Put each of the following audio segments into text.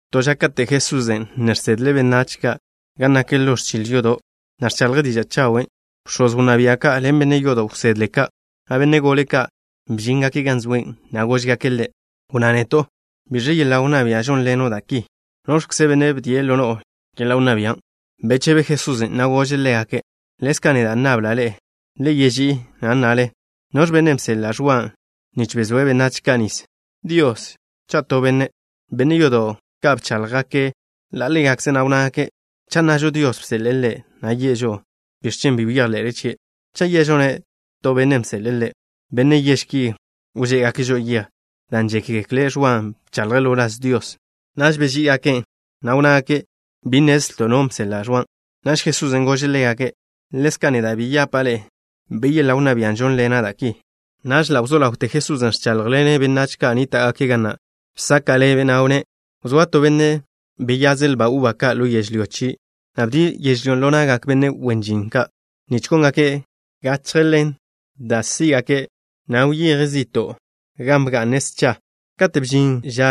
To ža, kate' Jesusen' ne žsedle' benách ka' gan nak ḻo ẕchil yodo', na' ẕchaḻje' diža' chawen', bx̱oz wnná bia' ka', ḻen benne' yodo' wsedle ka', na' benne' gole ka', bžíngake' gan zoe', na' góžgake' Ḻe': —Wnná neto'. ¿Biẕe yeḻa' wnná bia' žónḻeno' da' ki? ¿Noẕkze benne' bdie' ḻo no'o yeḻa' wnná bian'? Bechebe Jesusen', na' gože' ḻégake': —Ḻezka' neda' nnabla' ḻe'e to. Le yeží'i, na' nnale. ¿Noẕ benne' bseḻe'e Ẕwa nich bezóe' benách ka' nis? ¿Dios, cha' to benne'? Benne' yodo' ka' bcháḻjgake' ḻa' ḻégakze', na' wnnágake': —Cha' nnažo: Dios bseḻe'e ḻe', yi'e žo'o: “¿Biẕ chen' bi wyejḻe'le chie'?” Cha' ye'žo-ne': To benne' bseḻe'e ḻe', benne' yež ki wžé'egake' žo'o yej, dan' žékgekle' Ẕwan' bchaḻje' ḻo wláz Dios. Naž beží'igake', na' wnnágake': —Bi nnezlto' no benne' bseḻe'e Ẕwan'. Naž Jesusen' gože' ḻégake': —Ḻezka' neda' bi yapa' ḻe'e bi yeḻa' wnná bia' žónḻena' da' ki. Naž ḻa' wzó ḻawte Jesusen' ẕcháḻjḻene' benách ka' nníta'gake' ga na'. Bsaka' ḻebe', na' wnné': —Wzóa to benne' beyaze' lba uba ka' ḻo yežlyó chie', na' bdie' yežlyón' ḻo na'gak benne' wen žin ka' nich góngake' gachje ḻen ḻe' da' sí'gake', na' wyeje' zi'to' gan bga'ne' scha. Kate' bžin ža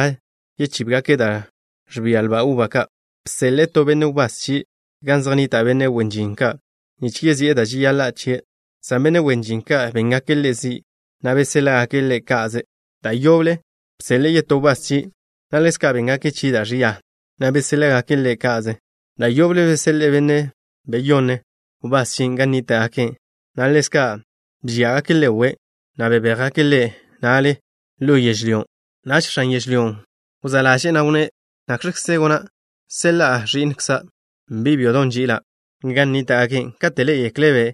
chíbgake' da' ẕžía lba uba ka', bseḻe'e to benne' wbás chie' gan zej nnita' benne' wen žin ka' nich si'e da' žeyaḻa' chie', san benne' wen žin ka' béngake' ḻe' zi', na' beséḻa'gake' ḻe' ka'ze. Da' yoble bseḻe'e yetó wbás chie', na' ḻezka' béngake' chie' da' ẕia, na' beséḻa'gake' ḻe' ka'ze. Da' yoble bseḻe'e benne' beyonne' wbás chie' gan nníta'gake', na' ḻezka' bžíagake' ḻe' we', na' bebéjgake' ḻe' na'le ḻo yežlyón'. ’Naž x̱an yežlyón' wzá' ḻaže'e, na' wnné': “¿Nakx̱kze gona'? Seḻa'a ẕi'nkza', bi' byodon' nži'ila', gan nníta'gake'. Katen' ḻé'egekle'-be',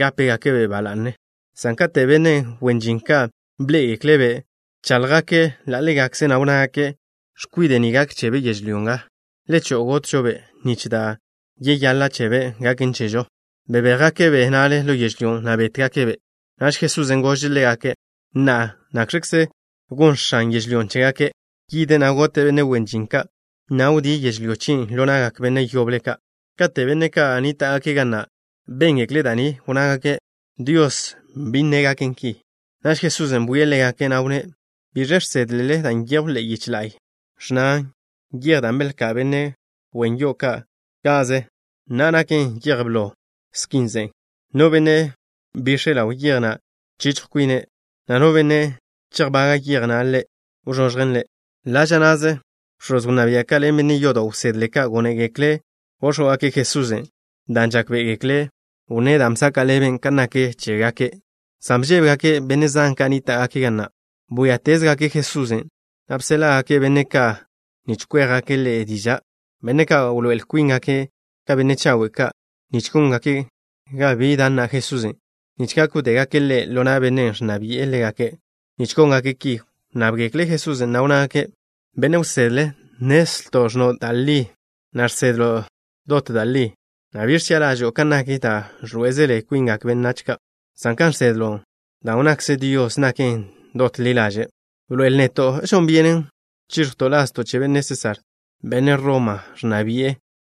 gápegake'-be' ba la'ne.” San katen' benne' wen žin ka' bḻé'egekle'-be', bcháḻjgake' ḻa' ḻégakze', na' wnnágake': “X̱kwide' ni gak chebe' yežlyó nga. Le cho'o, gotžo-be', nich da' yeyaḻa' chebe' gaken chežo.” Bebéjgake'-be' na'le ḻo yežlyón', na' bétgake'-be'. Naž Jesusen' gože' ḻégake': —Na'a, ¿nakx̱kze gon x̱an yežlyón' chégake'? Yide', na' gote' benne' wen žin ka', na' wdíe' yežlyó chien' ḻo na'gak benne' yoble ka'. Kate' benne' ka' nníta'gake' ga na' béngekle' da' ni, wnnágake': —Dios bi nne' gaken ki. Naž Jesusen' bwie' ḻégake', na' wnné': —¿Biẕe žsedle dan' nyejw ḻe'e yich la'y? Ẕnnan: Yej da' belká'n benne' wen yo'o ka' ka'ze, na'a naken yej blo skin ze'e. No benne' bix̱e' ḻaw yej na', chichjw kwine', na' no benne' chejbaga' yej na' ḻe', wzoẕjen ḻe'. Ḻa' ža na'ze, bx̱oz wnná bia' ka' ḻen benne' yodo' wsedle ka', gónegekle' góx̱wgake' Jesusen', dan' žákbe'egekle' wnné' dan' bsaka' ḻebe' kan nak chégake', san bžébegake' benne' zan ka' nníta'gake' ga na'. Bwíatezgake' Jesusen', na' bséḻa'gake' benne' ka' nich kwéjgake' Ḻe' diža', benne' ka' wḻoé'el kwíngake' ka benne' chawe' ka', nich góngake' ga bi da' nna Jesusen', nich gak wdégake' Ḻe' ḻo na' bennen' ẕnna bi'e ḻégake'. Nich góngake' ki, wnnábgekle' Jesusen', na' wnnágake': —Benne' wsedle, nnezlto' ẕnno' da' li, na' žsedlo' da' li, na' bi ẕchi'a ḻažo'o kan nak da' ẕḻoé'ezele kwingak benne' ka', san kan žsedlo' dan' wnnakze Dios naken dot ḻi ḻaže'. Bḻoe'el neto'. ¿Žon byenen chíẕjwto' lazto' che benne' Sésar, benne' Roma ẕnna bi'e,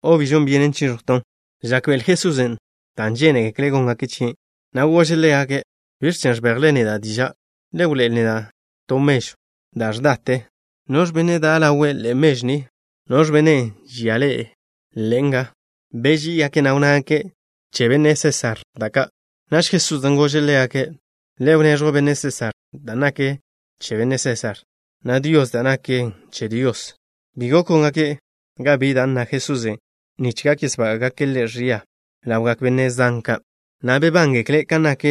o bi chíẕjwton'? Žákbe'ele Jesusen' da' žénegekle' góngake' chie', na' gože' ḻégake': —¿Biẕ chen' ẕbejle neda' diža'? Le wḻoé'el neda' to mežw da' ẕdate. ¿Noẕ benne' da' ḻawe' ḻe'e da' ni, na' noẕ benne' žia le' nga? Beží'igake', na' wnnágake': —Che benne' Sésar da' ka'. Naž Jesusen' gože' ḻégake': —Le wneẕjw benne' Sésar da' naken che benne' Sésar, na' Dios da' naken che Dios. Bi gok góngake' ga bi da' nna Jesusen' nich gak yesbága'gake' Ḻe' ẕia ḻawgak benne' zan ka', na' bebángekle' kan nak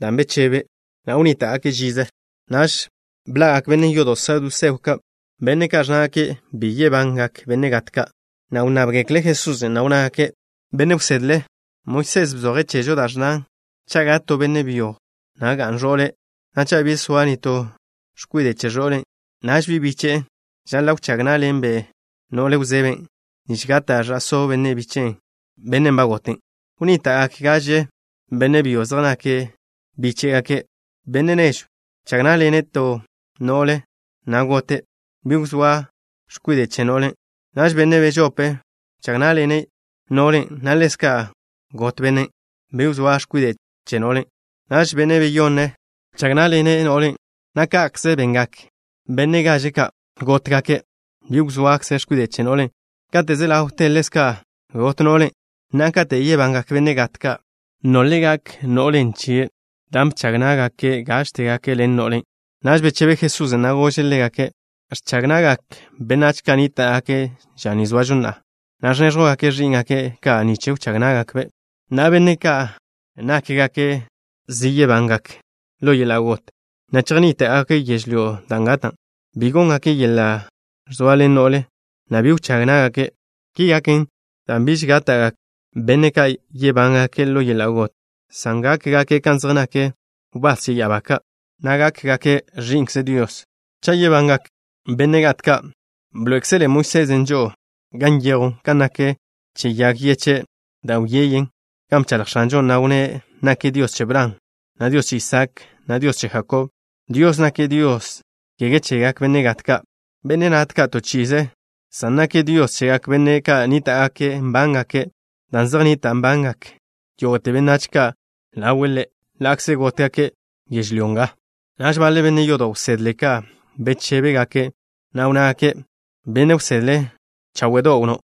da' bechebe', na' wnníta'gake' žize. Naž bḻa'gak benne' yodo' saduseo ka', benne' ka' ẕnnágake' bi yebangak benne' gat ka', na' wnnábgekle' Jesusen', na' wnnágake': —Benne' wsedle, Moisés bzoje' chežo da' ẕnnan: “Cha' gat to benne' byo, na' ga'n ẕo'le', na' cha' bi zoa nitó x̱kwide' chie', naž bi' biche'e žaḻa' wchág ná'ḻenbe' no'le wzeben', nich gata' ẕa'só benne' bíche'be', bennen' ba gote'.” Wnníta'gak gaže x̱kwide' byo zej nakbe' bíche'be'. X̱kwide' nežwn' bchag ná'ḻenbe' to x̱kwide' no'le, na' gotbe', bi wzóa x̱kwide' chebe'. Naž x̱kwide' bežope bchag ná'ḻenbe' no'len', na' ḻezka' got x̱kwiden', bi wzóa x̱kwide' chebe'. Naž x̱kwide' beyonne bchag ná'ḻenbe' no'len', na' ka'kze bengak bi' gaže ka'. Gótgakbe', bi wzóa x̱kwide' chégakbe'. Kate' ze ḻawte, ḻezka' got no'len'. Na'a, katen' yebangak benne' gat ka', ¿nolbe' gak no'len' chebe', dan' bchag ná'gakbe' gážtebe' ḻen no'len'? Naž bechebe Jesusen', na' gože' ḻégake': —Ẕchag na'gak benách ka' nníta'gake' ža ni zoažo na'a, na' ẕnéẕjwgake' ẕí'ngake' ka' nich wchág ná'gakbe'. Na'a, benne' ka' nákgake' zi yebángake' ḻo yeḻa' got, na' chejnníta'gake' yežlyó da' gatan', bi góngake' yeḻa' ẕzoaḻen no'le, na' bi wchág ná'gake'. Ki gaken, dan' biž gatgak benne' ka' yebángake' ḻo yeḻa' got, san gákgake' kan zej nak wbás che ya'abá ka', na' gákgake' ẕi'nkze Dios. Cha' yebangak benne' gat ka', bḻoé'ekzele Moisés žo'o gan nyejw kan nak che yag yeche' da' wyeyen, gan bchaḻj X̱anžon', na' wnné' nake' Dios che Bran, na' Dios che Isaak, na' Dios che Jakob. Dios nake' Dios, kege chegak benne' gat ka', benne' nátgake' to chi'ize, san nake' Dios chegak benne' ka' nníta'gake' nbángake', dan' zej nnita' nbangak yógo'te benách ka' ḻawe' Ḻe', ḻa'kze gótgake' yežlyó nga. Naž baḻe benne' yodo' wsedle ka' bechébegake', na' wnnágake': —Benne' wsedle, cháwe'do' wnnó'.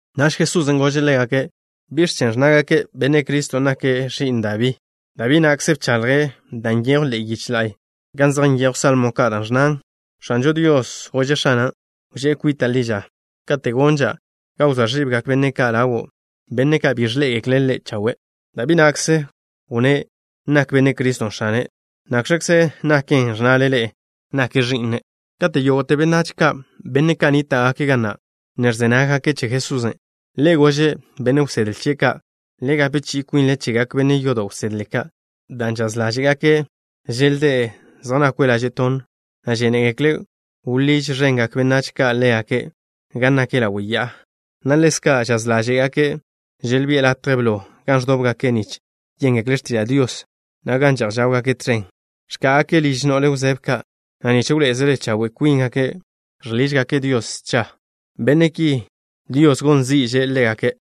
Naž Jesusen' gože' ḻégake': —¿Biẕ chen' ẕnnágake': “Benne' Criston' nake' ẕi'n Dabí”? Dabí na'kze bchaḻje' da' nyejw ḻe'e yich la'y gan zej nyejw salmo ka', da' ẕnnan: X̱anžo Dios gože' X̱ana': “Wžé' kwita' ḻi ža, kate' gonža' ga wzóa ẕibgak benne' ka' ḻawo', benne' ka' bi ẕḻé'egekle' Le' chawe'.” Dabí na'kze wnné' nak Benne' Criston' X̱ane'. ¿Nakx̱kze naken, ẕnnale ḻe'e nake' ẕi'ne'? Kate' yógo'te benách ka', benne' ka' nníta'gake' ga na', ne ẕze nággake' che Jesusen', Ḻe' gože' benne' wsedle chie' ka': —Le gape chi'i kwinle chegak benne' yodo' wsedle ka', dan' žaz ḻáže'gake' želdé' zej nakwe' laže' tonn, na' žénegekle' wḻíž ẕengak benách ka' ḻégake' gan nak ḻawe' ya'a, na' ḻezka' žaz ḻáže'gake' želbi'e latje blo gan ẕdóbgake' nich yéngekle' x̱tiža' Dios, na' gan že'j žáwgake' tẕen. Ẕká'agake' ližgak no'le wzebe ka', na' nich wḻoé'ezele chawe' kwíngake' žḻižgake' Dios scha. Benne' ki, Dios gon zi'že' ḻégake'.